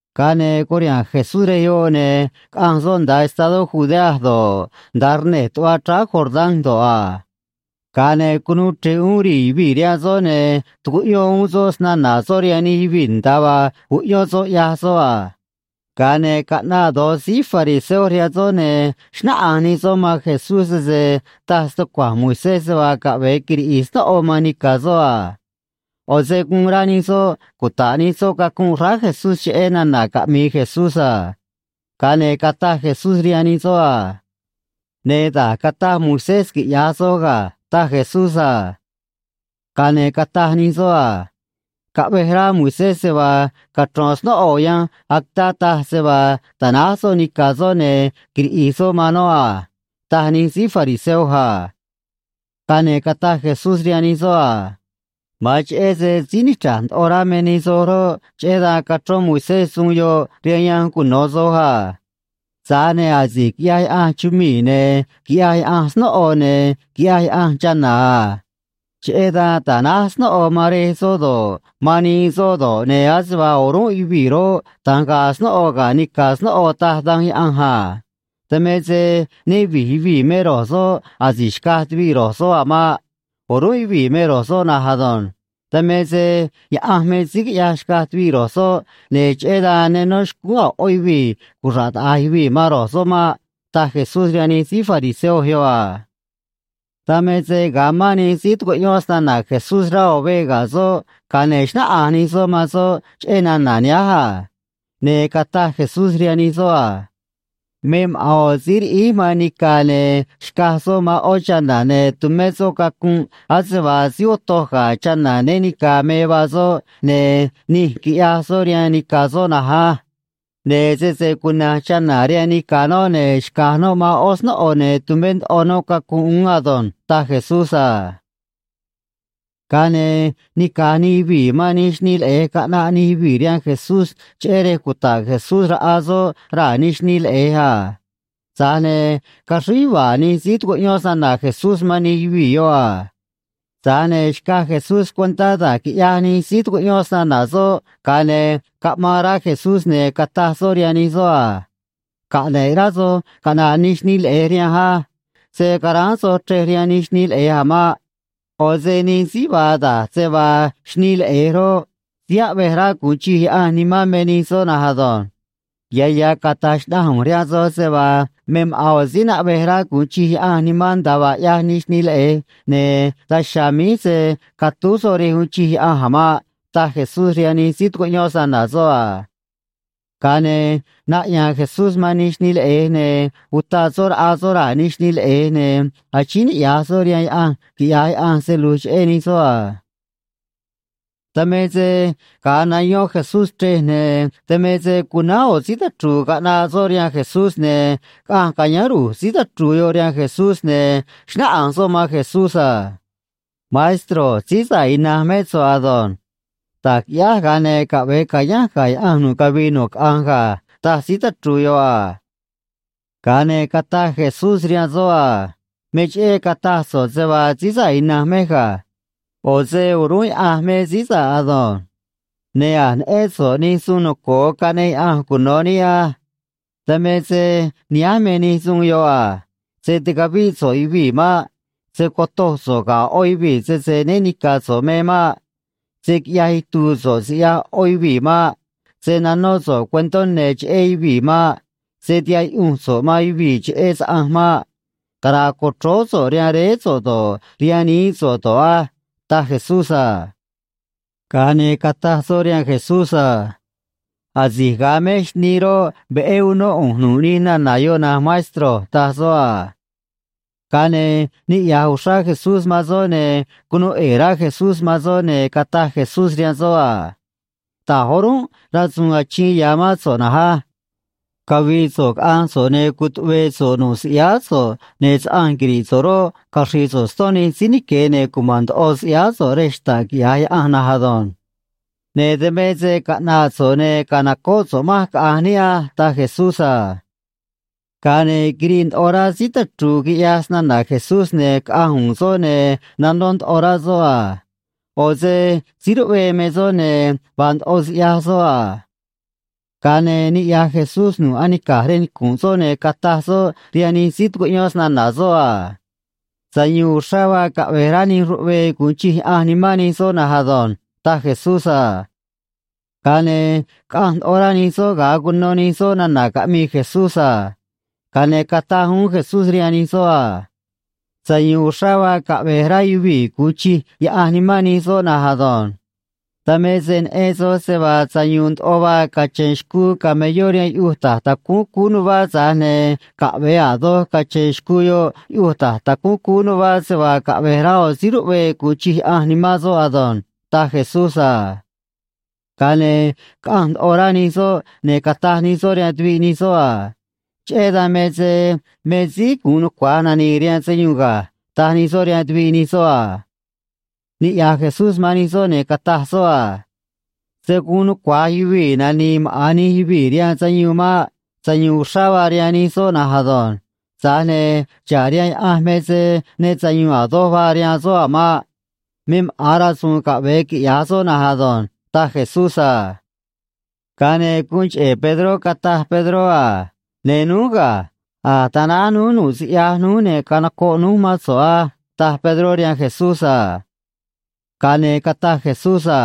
Ga̱a ne̱ curiha̱nj Jesús rej yoꞌ, ne̱ caꞌanj soꞌ nda̱a estadó Judea do̱ꞌ, nda̱a rne̱j tuꞌva chráá Jordán do̱ꞌ a. Ga̱a ne̱ cunuu chre̱ꞌ uún ri̱i̱ yuvii̱ rihaan soꞌ, ne̱ tucuꞌyón uún soꞌ snana̱ soꞌ rihaan nij yuvii̱, nda̱a vaa uꞌyón soꞌ ꞌyaj soꞌ a. Ga̱a ne̱ caꞌnaꞌ do̱j síí fariseo rihaan soꞌ, ne̱ xnáꞌanj nij soꞌ man Jesús sese taj stucua̱nj Moisés se vaa caꞌve̱e quiriꞌi̱j snóꞌo man nica̱ soꞌ a. ꞌO̱ se guun rá nij soꞌ cuta̱ꞌ nij soꞌ cacunꞌ xráá Jesús cheꞌé nana̱ caꞌmi̱i̱ Jesús a. Ga̱a ne̱ cataj Jesús rihaan nij soꞌ a: ―Ne̱ da̱j cataj Moisés quiꞌya̱j soj ga̱ ―taj Jesús a. Ga̱a ne̱ cataj nij soꞌ a: ―Caꞌvej rá Moisés se vaa cachro̱n snóꞌo ꞌo̱ yanj actá taj se vaa tanáj soꞌ nica̱ soꞌ ne̱ quiriꞌi̱j soꞌ man noꞌ a ―taj nij síí fariseo a. Ga̱a ne̱ cataj Jesús rihaan nij soꞌ a: ―Ma̱an cheꞌé se síí nichra̱j ndoꞌo rá me nij soj roꞌ, cheꞌé dan cachrón Moisés suun yoꞌ rihaan yanj cuno̱ soj a. Tza̱j ne̱ asi̱j quiꞌyaj Yaꞌanj chumii̱, ne̱ quiꞌyaj Yaꞌanj snóꞌo, ne̱ quiꞌyaj Yaꞌanj chana̱ a. “Cheꞌé dan ta̱náj snóꞌo man rej soꞌ do̱ꞌ, man nii soꞌ do̱ꞌ, ne̱ ase vaa o̱rúnꞌ yuvii̱ roꞌ, da̱nj ga̱a̱ snóꞌo ga̱ nica̱ snóꞌo”, taj Danj Yaꞌanj a. Dan me se né vi̱j yuvii̱ me ro̱j soꞌ asi̱j xcaj tuviꞌ ro̱j soꞌ a̱ maꞌ. O̱rúnꞌ yuvii̱ me ro̱j soꞌ na̱nj ado̱nj. Dan me se Yaꞌanj me síí quiꞌyaj xcaj tuviꞌ ro̱j soꞌ, ne̱ cheꞌé dan ne nó xcúún a̱ ꞌó yuvii̱ cuxra̱ꞌ taꞌa̱j yuvii̱ man ro̱j soꞌ maꞌ ―taj Jesús rihaan nij síí fariseo yoꞌ a. Dan me se ga̱a mán nij síí tucuꞌyón snana̱ Jesús rá ꞌo̱ veꞌ ga̱ soꞌ, ga̱a ne̱ xnáꞌanj nij soꞌ man soꞌ cheꞌé nana̱ nihánj a. Ne̱ cataj Jesús rihaan nij soꞌ a: ―Me maꞌa̱n ꞌo̱ síí riꞌíj man nica̱ ne̱ xcaj soꞌ man ꞌó chana̱, ne̱ tumé soꞌ cacunꞌ ase vaa síí otoj ga̱ chana̱ né ni̱ca̱ me vaa soꞌ, ne̱ nij quiꞌyaj soꞌ rihaan nica̱ soꞌ na̱nj á. Ne̱ sese cuna̱nj chana̱ rihaan nica̱ noꞌ, ne̱ xca̱j noꞌ man ꞌó snóꞌo, ne̱ tumé ndoꞌo noꞌ cacunꞌ uún ado̱nj ―taj Jesús a. Ga̱a ne̱ nica̱j nij yuvii̱ man nij xnii leꞌe̱j caꞌnaꞌ nij yuvii̱ rihaan Jesús, cheꞌé rej cuta̱ꞌ Jesús raꞌa soꞌ raa̱ nij xnii leꞌe̱j a. Tza̱j ne̱ caxríj yuva̱a̱ nij síí tucuꞌyón snana̱ Jesús man nij yuvii̱ yoꞌ a. Tza̱j ne̱ xcaj Jesús cuentá da̱j quiꞌyaj nij síí tucuꞌyón snana̱ soꞌ, ga̱a ne̱ caꞌmaan rá Jesús, ne̱ cataj soꞌ rihaan nij soꞌ a: ―Caꞌne̱ꞌ rá soj caꞌna̱ꞌ nij xnii leꞌe̱j rihanj á. Se̱ caráán soj chrej rihaan nij xnii leꞌe̱j a̱ maꞌ. ꞌO̱ se nij síí vaa da̱j se vaa xnii leꞌe̱j roꞌ, síí aꞌvej rá gu̱un chij Yaꞌanj nimán me nij soꞌ na̱nj ado̱nj. Ya̱ ya̱ cata̱j xnaꞌanj ꞌu̱nj rihaan soj se vaa me maꞌa̱n ꞌo̱ síí naꞌvej rá gu̱un chij Yaꞌanj nimán nda̱a vaa ꞌyaj nij xnii leꞌe̱j, ne̱ daj chiha̱a̱ míj se̱ catúj soꞌ rej uun chij Yaꞌanj a̱ maꞌ ―taj Jesús rihaan nij síí tucuꞌyón snana̱ soꞌ a. Ga̱a ne̱ naꞌya̱a̱n Jesús man nij xnii leꞌe̱j, ne̱ utaꞌ soꞌ raꞌa soꞌ raa̱ nij xnii leꞌe̱j, ne̱ achíín niꞌya̱j soꞌ rihaan Yaꞌanj quiꞌya̱j Yaꞌanj se lu̱j cheꞌé nij soꞌ a. Dan me se ga̱a nayón Jesús chrej, ne̱ dan me se cunánj ꞌo̱ síí tachru̱u̱ caꞌnaꞌ soꞌ rihaan Jesús, ne̱ caꞌanj ca̱yáán ru̱j síí tachru̱u̱ yoꞌ rihaan Jesús, ne̱ xnáꞌanj soꞌ man Jesús a: ―Maestro, síí sa̱ꞌ ina̱nj mé so̱ꞌ ado̱nj. Da̱j qui̱ꞌyáj ga̱a ne̱ caꞌve̱e ca̱yánj ga̱ Yaꞌanj nu̱ꞌ cavii nu̱ꞌ caꞌanj ga̱ ―taj síí tachru̱u̱ yoꞌ a. Ga̱a ne̱ cataj Jesús rihaan soꞌ a: ―Me cheꞌé cataj so̱ꞌ se vaa síí sa̱ꞌ ina̱nj mej ga̱. ꞌO̱ se o̱rúnꞌ Yaꞌanj me síí sa̱ꞌ ado̱nj. Ne̱ a̱j neꞌén so̱ꞌ nij suun noco̱o caꞌneꞌ Yaꞌanj cuno̱ níꞌ á. Dan me se nihánj me nij suun yoꞌ a: “Se̱ ticavíꞌ so̱ꞌ yuvii̱ maꞌ. Se̱ cotoj so̱ꞌ ga̱ ꞌó yuvii̱ sese né ni̱ca̱ so̱ꞌ me maꞌ. Se̱ quiꞌyaj itu̱u̱ so̱ꞌ siꞌyaj ꞌó yuvii̱ maꞌ. Se̱ nanó so̱ꞌ cuentó ne̱ cheꞌé yuvii̱ maꞌ. Se̱ tihaꞌ yuꞌunj so̱ꞌ man yuvii̱ cheꞌé saꞌanj maꞌ. Cara̱a̱ co̱chróó so̱ꞌ rihaan réé so̱ꞌ do̱ꞌ, rihaan nií so̱ꞌ do̱ꞌ á” ―taj Jesús a. Ga̱a ne̱ cataj soꞌ rihaan Jesús a: ―Asi̱j ga̱a mej xnii roꞌ, veꞌé unó ꞌu̱nj nu̱ꞌ nij nana̱ yoꞌ, na̱nj maestro ―taj soꞌ a. Ga̱a ne̱ niꞌya̱j uxrá Jesús man soꞌ, ne̱ cunuu ꞌe̱e̱ rá Jesús man soꞌ, ne̱ cataj Jesús rihaan soꞌ a: ―Da̱j o̱rúnꞌ rasu̱u̱n achiin ya̱ mán so̱ꞌ na̱nj á. Cavi̱i̱ so̱ꞌ caꞌa̱nj so̱ꞌ, ne̱ cutuꞌve̱e̱ so̱ꞌ nu̱ꞌ siꞌyáá so̱ꞌ, ne̱ saꞌanj quiri̱ꞌ so̱ꞌ roꞌ, caxri̱i̱ so̱ꞌ ston nij síí nique̱, ne̱ cuma̱n ndoꞌo siꞌyáá so̱ꞌ rej xta̱ꞌ, quiꞌya̱j Yaꞌanj na̱nj ado̱nj. Ne̱ dan me se caꞌna̱ꞌ so̱ꞌ, ne̱ ca̱nocóꞌ so̱ꞌ manj, caꞌa̱nj níꞌ á ―taj Jesús a. Ga̱a ne̱ quiriꞌ ndoꞌo rá síí tachru̱u̱, quiꞌyaj snana̱ Jesús, ne̱ caꞌanj u̱u̱n soꞌ, ne̱ nanó ndoꞌo rá soꞌ a. ꞌO̱ se síí ruꞌvee me soꞌ, ne̱ vaa ndoꞌo siꞌyaj soꞌ a. Ga̱a ne̱ niꞌya̱j Jesús nu̱ꞌ anica̱j rej nicu̱nꞌ soꞌ, ne̱ cataj soꞌ rihaan nij síí tucuꞌyón snana̱ soꞌ a: ―Sayu̱u̱n uxrá vaa caꞌve̱j rá nij ruꞌvee gu̱un chij Yaꞌanj nimán nij soꞌ na̱nj ado̱nj ―taj Jesús a. Ga̱a ne̱ caꞌanj ndoꞌo rá nij soꞌ ga̱a cuno nij soꞌ nana̱ caꞌmii Jesús a. Ga̱a ne̱ cataj uún Jesús rihaan nij soꞌ a: ―Sayu̱u̱n uxrá vaa caꞌve̱j rá yuvii̱ gu̱un chij Yaꞌanj nimán nij soꞌ na̱nj ado̱nj. Dan me se neꞌen soj se vaa sayu̱u̱n ndoꞌo vaa cache̱n xcuu camelló rihaan yuꞌuj ta̱j tacúún cúú nuvá, tza̱j ne̱ caꞌve̱e a̱ doj cache̱n xcuu yoꞌ yuꞌuj ta̱j tacúún cúú nuvá se vaa caꞌve̱j rá ꞌo̱ síí ruꞌvee gu̱un chij Yaꞌanj nimán soꞌ ado̱nj ―taj Jesús a. Ga̱a ne̱ caꞌanj ndoꞌo rá nij soꞌ, ne̱ cataj nij soꞌ rihaan tuviꞌ nij soꞌ a: ―Cheꞌé dan me se me síí gu̱un nucua̱j nani̱i̱ rihaan sayuun ga̱ ―taj nij soꞌ rihaan tuviꞌ nij soꞌ a. Niꞌya̱j Jesús man nij soꞌ, ne̱ cataj soꞌ a: ―Se̱ guun nucua̱j yuvii̱ nani̱i̱ maꞌa̱n nij yuvii̱ rihaan sayuun maꞌ. Sayu̱u̱n uxrá vaa rihaan nij soꞌ na̱nj ado̱nj. Tza̱j ne̱ xa̱ꞌ rihaan Yaꞌanj me se ne sayu̱u̱n a̱ doj vaa rihaan soꞌ a̱ maꞌ. Me maꞌa̱n rasu̱u̱n caꞌve̱e quiꞌya̱j soꞌ na̱nj ado̱nj ―taj Jesús a. Ga̱a ne̱ guun cheꞌe̱ Pedró cataj Pedró a: ―Ne̱ núj ga̱. A̱j tanáj núj nu̱ꞌ siꞌyaj núj, ne̱ canocoꞌ núj mán so̱ꞌ á ―taj Pedró rihaan Jesús a. Ga̱a ne̱ cataj Jesús a: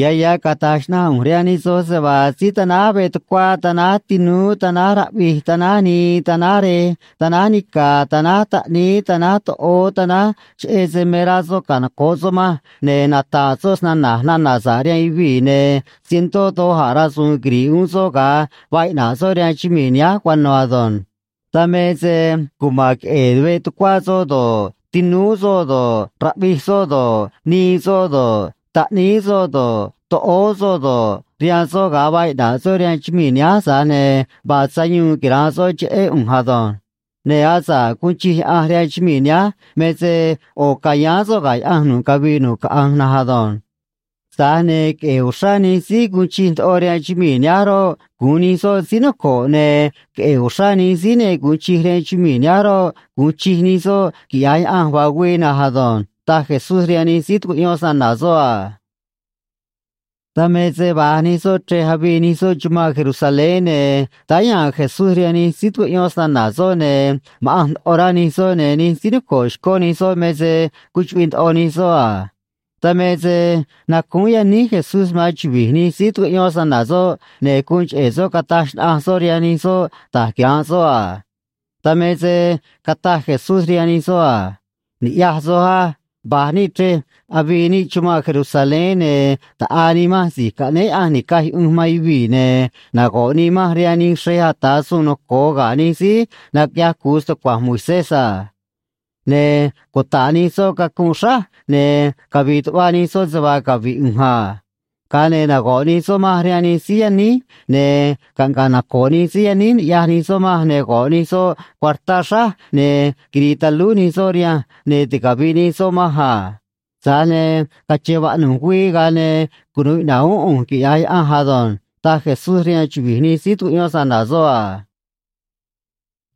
―Ya̱ ya̱ cata̱j xnaꞌanj ꞌu̱nj rihaan nij soj se vaa síí tanáj veꞌ tucuá tanáj tinúú tanáj raꞌvij tanáj nii tanáj rej tanáj nica̱ tanáj taꞌníí tanáj toꞌóó tanáj cheꞌé se me rá soꞌ canoco̱ꞌ soꞌ manj ne̱ nata̱ꞌ soꞌ snana̱j nana̱ sa̱ꞌ rihaan yuvii̱, ne̱ cientó doj a̱ rasu̱u̱n quiri̱ꞌ uún soꞌ ga̱a vaa iꞌna̱ꞌ soꞌ rihaan chumii̱ nihánj cuano̱ ado̱nj. Dan me se cuma̱n queꞌe̱e̱ veꞌ tucuá soꞌ do̱ꞌ, tinúú soꞌ do̱ꞌ, raꞌvij soꞌ do̱ꞌ, nii soꞌ do̱ꞌ, taꞌníí soꞌ do̱ꞌ, toꞌóó soꞌ do̱ꞌ, rihaan soꞌ ga̱a vaa iꞌna̱ꞌ soꞌ rihaan chumii̱ nihánj, tza̱j ne̱ vaa sayuun quira̱nꞌ soꞌ cheꞌé ꞌu̱nj ado̱nj. Ne̱ asa̱ꞌ guun chij Yaꞌanj rihaan chumii̱ nihánj me se ꞌo̱ ca̱yáán soꞌ ga̱ Yaꞌanj nu̱ꞌ cavii nu̱ꞌ caꞌanj na̱nj ado̱nj. Tza̱j ne̱ queꞌe̱e̱ uxrá nij síí guun chij ndoꞌo rihaan chumii̱ nihánj roꞌ, gu̱un nij soꞌ síí noco̱ꞌ, ne̱ queꞌe̱e̱ uxrá nij síí ne gu̱un chij rihaan chumii̱ nihánj roꞌ, gu̱un chij nij soꞌ, quiꞌya̱j Yaꞌanj vaa güii na̱nj ado̱nj ―taj Jesús rihaan nij síí tucuꞌyón snana̱ soꞌ a. Dan me se va̱j nij soꞌ chrej avii nij soꞌ chumanꞌ Jerusalén, ne̱ táá ya̱a̱n Jesús rihaan nij síí tucuꞌyón snana̱ soꞌ, ne̱ maꞌanj ndoꞌo rá nij soꞌ, ne̱ nij síí noco̱ꞌ xcó nij soꞌ me se cuchuꞌviꞌ ndoꞌo nij soꞌ a. Dan me se nacúún yaníj Jesús man chuvi̱j nij síí tucuꞌyón snana̱ soꞌ, ne̱ guun cheꞌe̱ soꞌ cataj xnaꞌanj soꞌ rihaan nij soꞌ da̱j quira̱nꞌ soꞌ a. Dan me se cataj Jesús rihaan nij soꞌ a: ―Ni̱ꞌyaj soj á. Va̱j níꞌ chrej avii níꞌ chumanꞌ Jerusalén, ne̱ ta̱ꞌaa nii manj Si̱j Caꞌnéé Yaꞌanj Ni̱caj Yuꞌunj man Yuvii̱, ne̱ nago̱ꞌ nii manj rihaan nij xrej ata̱ suun noco̱o ga̱ nij síí naquiꞌyaj cu̱u stucua̱nj Moisés a. Ne̱ cuta̱ꞌ nij soꞌ cacunꞌ xráj, ne̱ cavi̱i̱ tuꞌva nij soꞌ se vaa cavi̱ꞌ ꞌu̱nj a. Ga̱a ne̱ nago̱ꞌ nij soꞌ manj rihaan nij síí yaníj, ne̱ caꞌnga̱ꞌ naco̱o̱ nij síí yaníj ni̱ꞌyaj nij soꞌ manj, ne̱ go̱ꞌ nij soꞌ cuartá xráj, ne̱ quiri̱i̱ talúj nij soꞌ rihanj, ne̱ ticavi̱ꞌ nij soꞌ manj a. Tza̱j ne̱ cache̱n vaꞌnu̱j güii, ga̱a ne̱ cunu̱u iꞌna̱ꞌ uún ꞌu̱nj, quiꞌya̱j Yaꞌanj ado̱nj ―taj Jesús rihaan chuvi̱j nij síí tucuꞌyón snana̱ soꞌ a.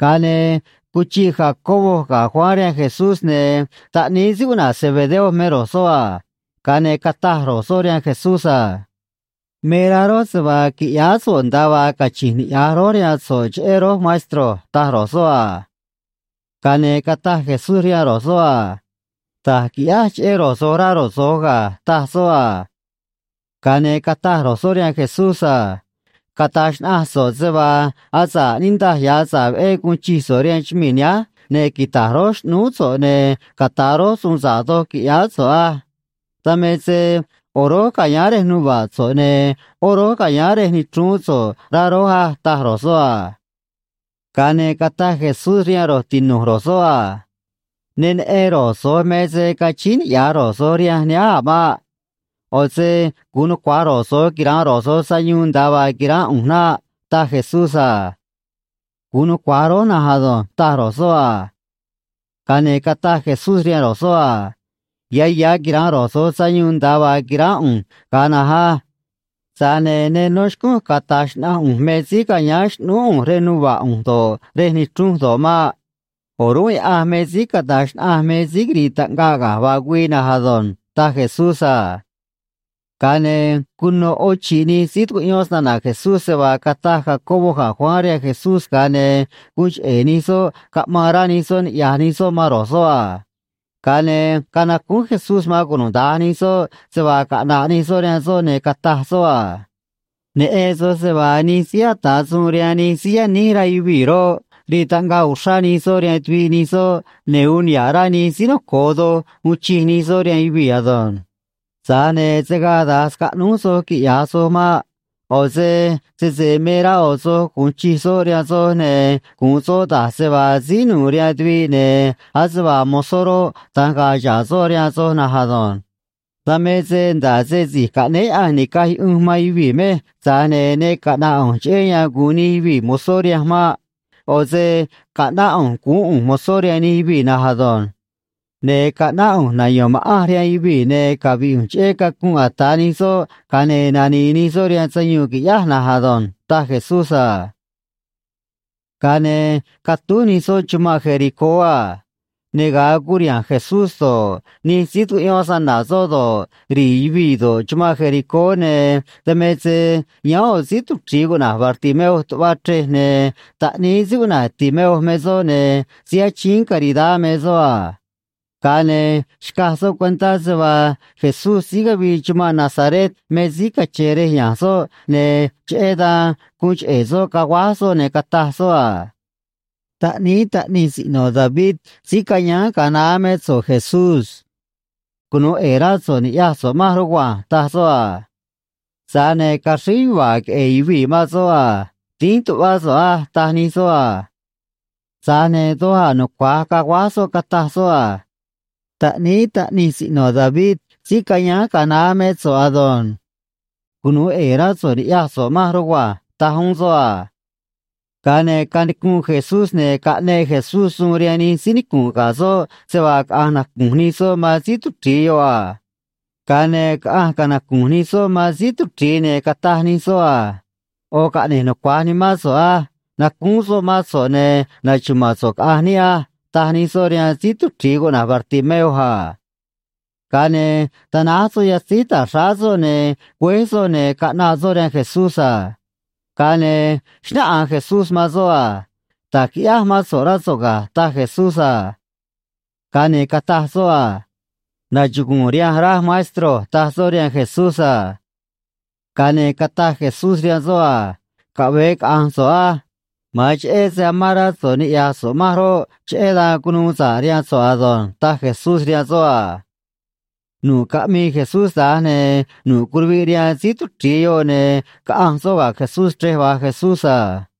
Ga̱a ne̱ cuchiꞌ Jacobo ga̱ Juan rihaan Jesús, ne̱ taꞌníí síí cuꞌna̱j Zebedeo me ro̱j soꞌ a. Ga̱a ne̱ cataj ro̱j soꞌ rihaan Jesús a: ―Me rá rój se vaa qui̱ꞌyáá so̱ꞌ nda̱a vaa cachi̱nj niꞌya̱j rój rihaan so̱ꞌ cheꞌé rój, maestro ―taj ro̱j soꞌ a. Ga̱a ne̱ cataj Jesús rihaan ro̱j soꞌ a: ―Da̱j qui̱ꞌyáj cheꞌé ro̱j so̱j, rá ro̱j so̱j ga̱ ―taj soꞌ a. Ga̱a ne̱ cataj ro̱j soꞌ rihaan Jesús a: ―Cata̱j xnaꞌanj so̱ꞌ se vaa asa̱ꞌ niꞌndaj ya̱ sa̱ꞌ veꞌé guun chij so̱ꞌ rihaan chumii̱ nihánj, ne̱ quita̱j rój xꞌnúú so̱ꞌ, ne̱ ca̱ta̱ rój suun sa̱ꞌ doj, qui̱ꞌyáá so̱ꞌ á. Dan me se ꞌo̱ rój ca̱yáán rej nuva̱ꞌ so̱ꞌ, ne̱ ꞌó rój ca̱yáán rej ni̱chruún so̱ꞌ, rá rój a ―taj ro̱j soꞌ a. Ga̱a ne̱ cataj Jesús rihaan ro̱j tinu̱j ro̱j soꞌ a: ―Ne neꞌen ro̱j so̱j me se cachíín niꞌya̱j ro̱j so̱j rihanj nihánj a̱ maꞌ. ꞌO̱ se gu̱un nucua̱j ro̱j so̱j quira̱nꞌ ro̱j so̱j sayuun nda̱a vaa qui̱ránꞌ ꞌu̱nj naꞌ ―taj Jesús a. ―Gu̱un nucua̱j rój na̱nj ado̱nj ―taj ro̱j soꞌ a. Ga̱a ne̱ cataj Jesús rihaan ro̱j soꞌ a: ―Ya̱ ya̱ quira̱nꞌ ro̱j so̱j sayuun nda̱a vaa qui̱ránꞌ ꞌu̱nj ga̱a na̱nj á. Tza̱j ne̱ ne nó xcúnj cata̱j xnaꞌanj ꞌu̱nj me síí ca̱yáán xꞌnúú ꞌu̱nj rej nuva̱ꞌ ꞌu̱nj do̱ꞌ, rej ni̱chrunj do̱ꞌ maꞌ. O̱rúnꞌ Yaꞌanj me síí cata̱j xnaꞌanj me síí quiri̱i̱ taꞌngaꞌ ga̱j vaa güii na̱nj ado̱nj ―taj Jesús a. Ga̱a ne̱ cuno ꞌó chi̱ꞌ nij síí tucuꞌyón snana̱ Jesús se vaa cataj Jacobo ga̱ Juan rihaan Jesús, ga̱a ne̱ guun cheꞌe̱ nij soꞌ caꞌmaan rá nij soꞌ niꞌya̱j nij soꞌ man ro̱j soꞌ a. Ga̱a ne̱ canacúún Jesús man cunuda̱nj nij soꞌ se vaa caꞌna̱ꞌ nij soꞌ rihaan soꞌ, ne̱ cataj soꞌ a: ―Neꞌen soj se vaa nij síí ata̱ suun rihaan nij síí yaníj rá yuvii̱ roꞌ, rii taꞌngaꞌ uxrá nij soꞌ rihaan tuviꞌ nij soꞌ, ne̱ uun niha̱ꞌ rá nij síí noco̱o doj uun chij nij soꞌ rihaan yuvii̱ ado̱nj. Tza̱j ne̱ se̱ gaa da̱nj scaꞌnúj soj quiꞌya̱j soj maꞌ. ꞌO̱ se sese me rá ꞌo̱ soj gu̱un chij soꞌ rihaan soj, ne̱ gu̱un soꞌ da̱j se vaa síí nu̱u̱ rihaan tuviꞌ, ne̱ ase vaa mozó roꞌ, da̱nj ga̱a̱ xa̱ꞌ soꞌ rihaan soj na̱nj ado̱nj. Dan me se nda̱ꞌ se Si̱j Caꞌnéé Yaꞌanj Ni̱caj Yuꞌunj man Yuvii̱ mej, tza̱j ne̱ ne caꞌna̱ꞌ ꞌu̱nj cheꞌé yan gu̱un nij yuvii̱ mozó rihanj maꞌ. ꞌO̱ se caꞌnáꞌ ꞌu̱nj guún ꞌu̱nj mozó rihaan nij yuvii̱ na̱nj ado̱nj. Ne̱ caꞌnáꞌ ꞌu̱nj nayo̱n ma̱ꞌanj rihaan yuvii̱ ne̱ cavi̱ꞌ ꞌu̱nj cheꞌé cacunꞌ ata̱ nij soꞌ, ga̱a ne̱ nani̱i̱ nij soꞌ rihaan sayuun, qui̱ꞌyáj na̱nj ado̱nj ―taj Jesús a. Ga̱a ne̱ catúj nij soꞌ chumanꞌ Jericó a. Ne̱ ga̱a curiha̱nj Jesús do̱ꞌ, nij síí tucuꞌyón snana̱ soꞌ do̱ꞌ, ri̱i̱ yuvii̱ do̱ꞌ, chumanꞌ Jericó, ne̱ dan me se yáán ꞌo̱ síí tuchri̱i cuꞌna̱j Bartimeo tuꞌva chrej, ne̱ taꞌníí síí cuꞌna̱j Timeo me soꞌ, ne̱ síí achíín caridad me soꞌ a. Ga̱a ne̱ xcaj soꞌ cuentá se vaa Jesús síí cavii chumanꞌ Nazaret me síí cache̱n rej ya̱nj soꞌ, ne̱ cheꞌé dan guun cheꞌe̱ soꞌ caguáj soꞌ, ne̱ cataj soꞌ a: ―Taꞌníí Taꞌnij Siꞌno̱ David síí cayáán ga̱a naá mé so̱ꞌ, Jesús. Cunu̱u ꞌe̱e̱ rá so̱ꞌ ni̱ꞌyaj so̱ꞌ manj rugua̱nj ―taj soꞌ a. Tza̱j ne̱ caxríj yuva̱a̱ queꞌe̱e̱ yuvii̱ man soꞌ a: ―Dínj tuꞌvá so̱ꞌ á ―taj nij soꞌ a. Tza̱j ne̱ doj a̱ nucua̱j caguáj soꞌ, cataj soꞌ a: ―Taꞌníí Taꞌnij Siꞌno̱ David síí cayáán ga̱a naá mé so̱ꞌ ado̱nj. Cunu̱u ꞌe̱e̱ rá so̱ꞌ ni̱ꞌyaj so̱ꞌ manj rugua̱nj ―taj uún soꞌ a. Ga̱a ne̱ canicunꞌ Jesús, ne̱ caꞌneꞌ Jesús suun rihaan nij síí nicu̱nꞌ ga̱ soꞌ se vaa caꞌa̱nj nacu̱nj nij soꞌ man síí tuchri̱i yoꞌ a. Ga̱a ne̱ caꞌanj canacu̱nj nij soꞌ man síí tuchri̱i, ne̱ cataj nij soꞌ a: ―ꞌO̱ caꞌne̱j nucuaj nimán so̱ꞌ á. Nacúún soꞌ mán so̱ꞌ, ne̱ na̱xuma̱a̱n so̱ꞌ, caꞌa̱nj níꞌ á ―taj nij soꞌ rihaan síí tuchri̱i cuꞌna̱j Bartimeo a. Ga̱a ne̱ tanáj soꞌ yatzíj ta̱j xráá soꞌ, ne̱ güéj soꞌ, ne̱ caꞌnaꞌ soꞌ rihaan Jesús a. Ga̱a ne̱ xnáꞌanj Jesús man soꞌ a: ―Da̱j qui̱ꞌyáj mán so̱ꞌ, rá so̱ꞌ ga̱ ―taj Jesús a. Ga̱a ne̱ cataj soꞌ a: ―Nachugu̱u̱n rihanj, raj, maestro ―taj soꞌ rihaan Jesús a. Ga̱a ne̱ cataj Jesús rihaan soꞌ a: ―Caꞌve̱e caꞌa̱nj so̱ꞌ á. Ma̱an cheꞌé se amán rá so̱ꞌ niꞌya̱j so̱ꞌ manj roꞌ, cheꞌé dan cunuu sa̱ꞌ rihaan so̱ꞌ ado̱nj ―taj Jesús rihaan soꞌ a. Nu̱ꞌ caꞌmii Jesús da̱nj, ne̱ nu̱ꞌ curuviꞌ rihaan síí tuchri̱i yoꞌ, ne̱ caꞌanj soꞌ ga̱ Jesús chrej va̱j Jesús a.